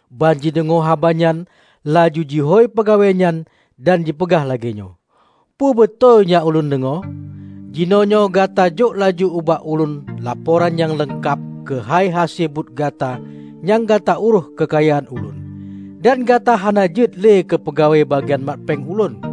Banjideungoe haba nyan laju jihôi peugawée nyan dan jipeugah lagée nyoe, 'Peubeutôi nyang ulôn deungoe? Jinoenyoe gata jok laju ubak ulôn laporan nyang leungkab keuhai hase buet gata nyang gata urôh keukayaan ulôn. Dan gata hana jeuet le keupeugawée bagian mat péng ulôn.'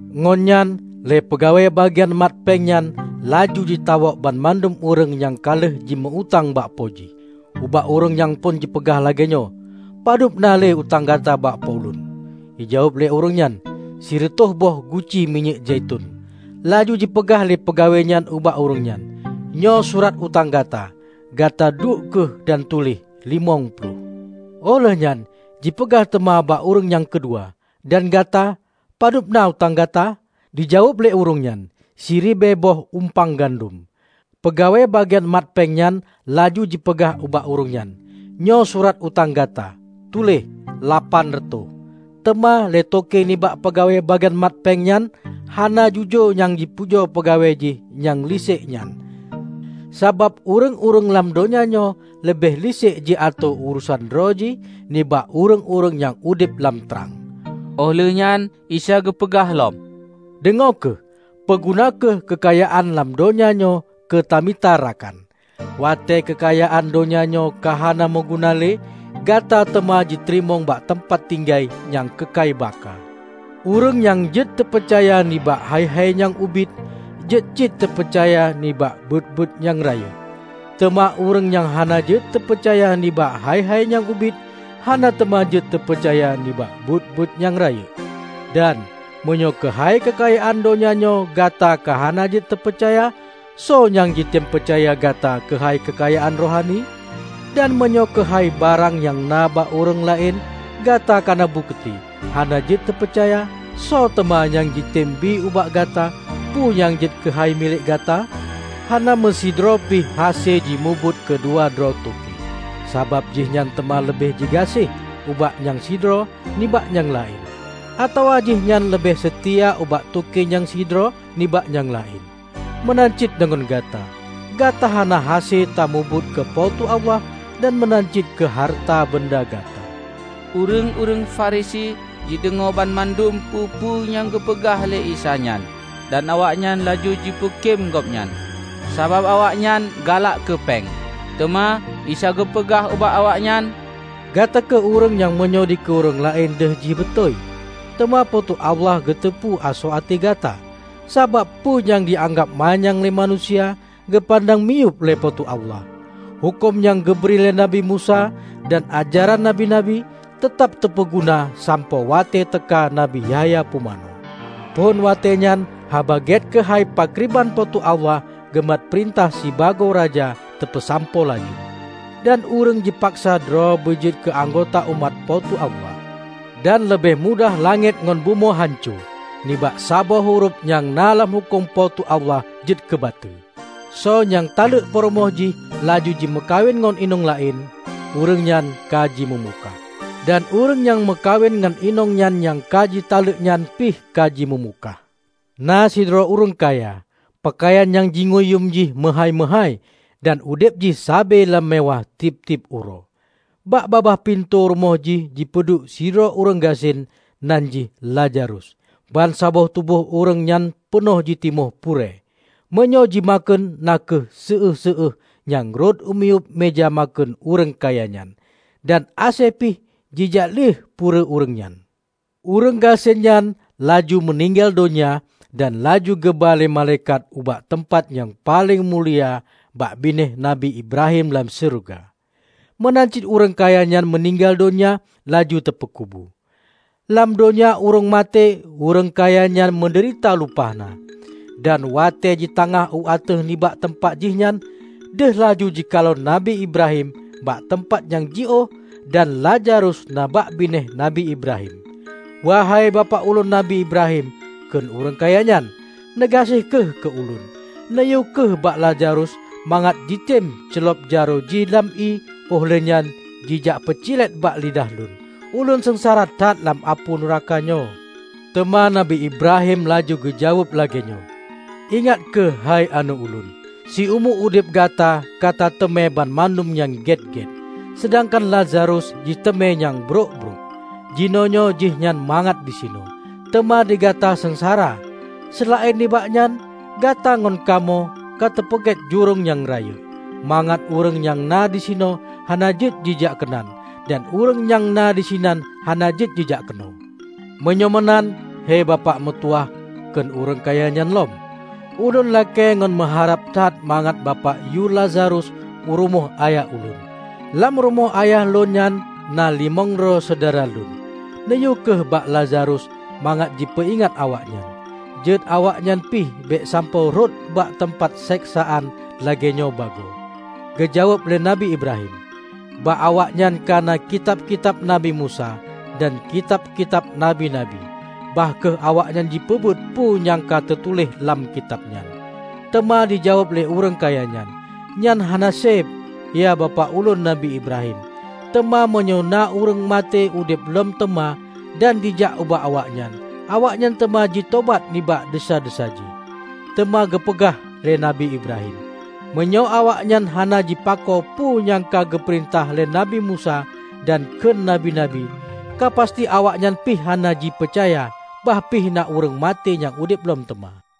Ngon nyan, lé peugawée bagian mat péng nyan laju jitawök banmandum ureuëng nyang ka lheueh jimeu-utang bak Po jih. Ubak ureuëng nyang phon jipeugah lagée nyoe, 'Padub na le utang gata bak Po ulôn?' Jijaweueb lé ureuëng nyan, 'Sireutôh boh guci minyéuk zaiton.' Laju jipeugah lé peugawée nyan ubak ureuëng nyan, 'Nyoe surat utang gata. Gata duek kheueh dan tuléh: limong ploh.' Óh lheueh nyan jipeugah teuma bak ureuëng nyang keudua, 'Dan gata, padubna utang gata?' Jijaweueb lé ureuëng nyan, 'Siribée boh umpang gandom.' Peugawée bagian mat péng nyan laju jipeugah bak ureuëng nyan, 'Nyoe surat utang gata, tuléh: lapan reutôh.' Teuma lé toke nibak peugawée bagian mat péng nyang hana jujoe nyan jipujoe peugawée jih nyang lisék nyan; sabab ureuëng-ureuëng lam donya nyoe leubeh lisék jiatoe urosan droe jih nibak ureuëng-ureuëng nyang udeb lam trang." Óh lheuehnyan Isa geupeugah lom, "Deungoe kheueh! Peuguna kheueh keukayaan lam donya nyoe keu tamita rakan, watée keukayaan donya nyoe ka hana meuguna le, gata teuma jiteurimong bak teumpat tinggai nyang keukai baka. Ureuëng nyang jeuet teupeucaya nibak hai-hai nyang ubit, jeuet cit teupeucaya nibak buet-buet nyang rayeuk. Teuma ureuëng nyang hana jeuet teupeucaya nibak hai-hai nyang ubit, hana teuma jeuet teupeucaya nibak buet-buet nyang rayeuk. Dan, meunyoe keuhai keukayaan donya nyoe gata ka hana jeuet teupeucaya, soe nyang jitem peucaya gata keuhai keukayaan rohani? Dan meunyoe keuhai barang nyang na bak ureuëng laén, gata kana bukeuti hana jeuet teupeucaya, soe teuma nyang jitem bi ubak gata peue nyang jeuet keuhai milék gata? Hana meusidroe pih hase jimubuet keu dua droe toke; sabab jihnyan teuma leubeh jigaséh ubak nyang sidroe nibak nyang laén, atawa jihnyan leubeh seutia ubak toke nyang sidroe nibak nyang laén. Meunan cit deungon gata. Gata hana hase tamubuet keu Po teu Allah dan meunan cit keu hareuta beunda gata." Ureuëng-ureuëng Farisi jideungoe banmandum peue-peue nyang geupeugah lé Isa nyan. Dan awaknyan laju jipeukém Gobnyan, sabab awaknyan galak keupeng. Teuma Isa geupeugah ubak awaknyan, "Gata kheueh ureuëng meunyoe dikeue ureuëng laén deuh jih beutôi, teuma Po teu Allah geuteupeue asoe até gata. Sabab peue nyang jianggab manyang lé manusia, geupandang miyueb lé Po teu Allah. Huköm nyang geubri lé Nabi Musa dan ajaran Nabi-nabi, teutab teupeuguna sampoe watée teuka Nabi Yahya Pumanö. Phon watée nyan Haba Gét keuhai pakriban Po teu Allah geumat peurintah sibagoe Raja teupeusampoe laju. Dan ureuëng jipaksa droe beu jeuet keu anggota umat Po teu Allah. Dan leubeh mudah langét ngon bumoe hanco, nibak saboh hurof nyang na lam Huköm Po teu Allah jeuet keubateue. Soe nyang taleuek peurumoh jih laju jimeukawen ngon inong laén, ureuëng nyan ka jimeumukah, dan ureuëng nyang meukawen ngon inong nyan nyang ka jitaleuek nyan pih ka jimeumukah." "Na sidroe ureuëng kaya. Peukayan nyang jingui yuem jih meuhái-meuhái, dan udeb jih sabe lam meuwáh tieb-tieb uroe. Bak babah pintoe rumoh jih jipeuduek sidroe ureuëng gasien nan jih Lazarus. Bansaboh tuboh ureuëng nyan peunoh jitimoh purée. Meunyoe jimakheun na kheueh séueh-séueh nyang rhot u miyueb meuja makheun ureuëng kaya nyan. Dan asée pih jijak lieh purée ureuëng nyan. Ureuëng gasien nyan laju meuninggai donya dan laju geuba lé malaikat ubak teumpat nyang paleng mulia bak binéh Nabi Ibrahim lam syeuruga. Meunan cit ureuëng kaya nyan meuninggai donya laju teupeukubu. Lam donya ureuëng maté ureuëng kaya nyan meudeurita lumpah na. Dan watée jitangah u ateueh nibak teumpat jih nyan, deuh laju jikalon Nabi Ibrahim bak teumpat nyang jiôh dan Lazarus na bak binéh Nabi Ibrahim. 'Wahei Bapak ulôn Nabi Ibrahim!' kheun ureuëng kaya nyan. 'Neugaséh kheueh keu ulôn, neuyue kheueh bak Lazarus mangat jitem ceulob jaroe jih lam ié óh lheuehnyan jijak peucilét bak lidah lôn. Ulôn seungsara that lam apui nuraka nyoe!' Teuma Nabi Ibrahim laju geujaweueb lagée nyoe, 'Ingat kheueh héi aneuëk ulôn: siumu udeb gata katateumé banmandum nyang gét-gét, seudangkan Lazarus jiteumé nyang brok-brok. Jinoenyoe jihnyan mangat disinoe, teuma digata seungsara. Seulaén nibak nyan, gata ngon kamoe kateupeugét jurông nyang rayeuk, mangat ureuëng nyang na disinoe hana jeuet jijak keunan dan ureuëng nyang na disinan hana jeuet jijak keunoe!' 'Meunyoe meunan, hei Bapak meutuwah,' kheun ureuëng kaya nyan lom, 'Ulôn lakée ngon meuharab that mangat Bapak yue Lazarus u rumoh ayah ulôn. Lam rumoh ayah lôn nyan na limong droe syedara lôn. Neuyue kheueh bak Lazarus mangat jipeuingat awaknyan, jeuet awaknyan pih bék sampoe rhot bak teumpat seksaan lagée nyoe bagoe.' Geujaweueb lé Nabi Ibrahim, 'Bak awaknyan ka na kitab-kitab Nabi Musa dan kitab-kitab nabi-nabi! Bah kheueh awaknyan jipeubuet peue nyang ka teutuléh lam kitab nyan!' Teuma jijaweueb lé ureuëng kaya nyan, 'Nyan hana séb, ya Bapak ulôn Nabi Ibrahim. Teuma meunyoe na ureuëng maté udeb lom teuma dan jijak ubak awaknyan, awaknyan teuma jitobat nibak desya-desya jih.' Teuma geupeugah lé Nabi Ibrahim, 'Meunyoe awaknyan hana jipako peue nyang ka geupeurintah lé Nabi Musa dan kheun nabi-nabi, ka pasti awaknyan pih hana jipeucaya, bah pih na ureuëng maté nyang udeb lom teuma.' "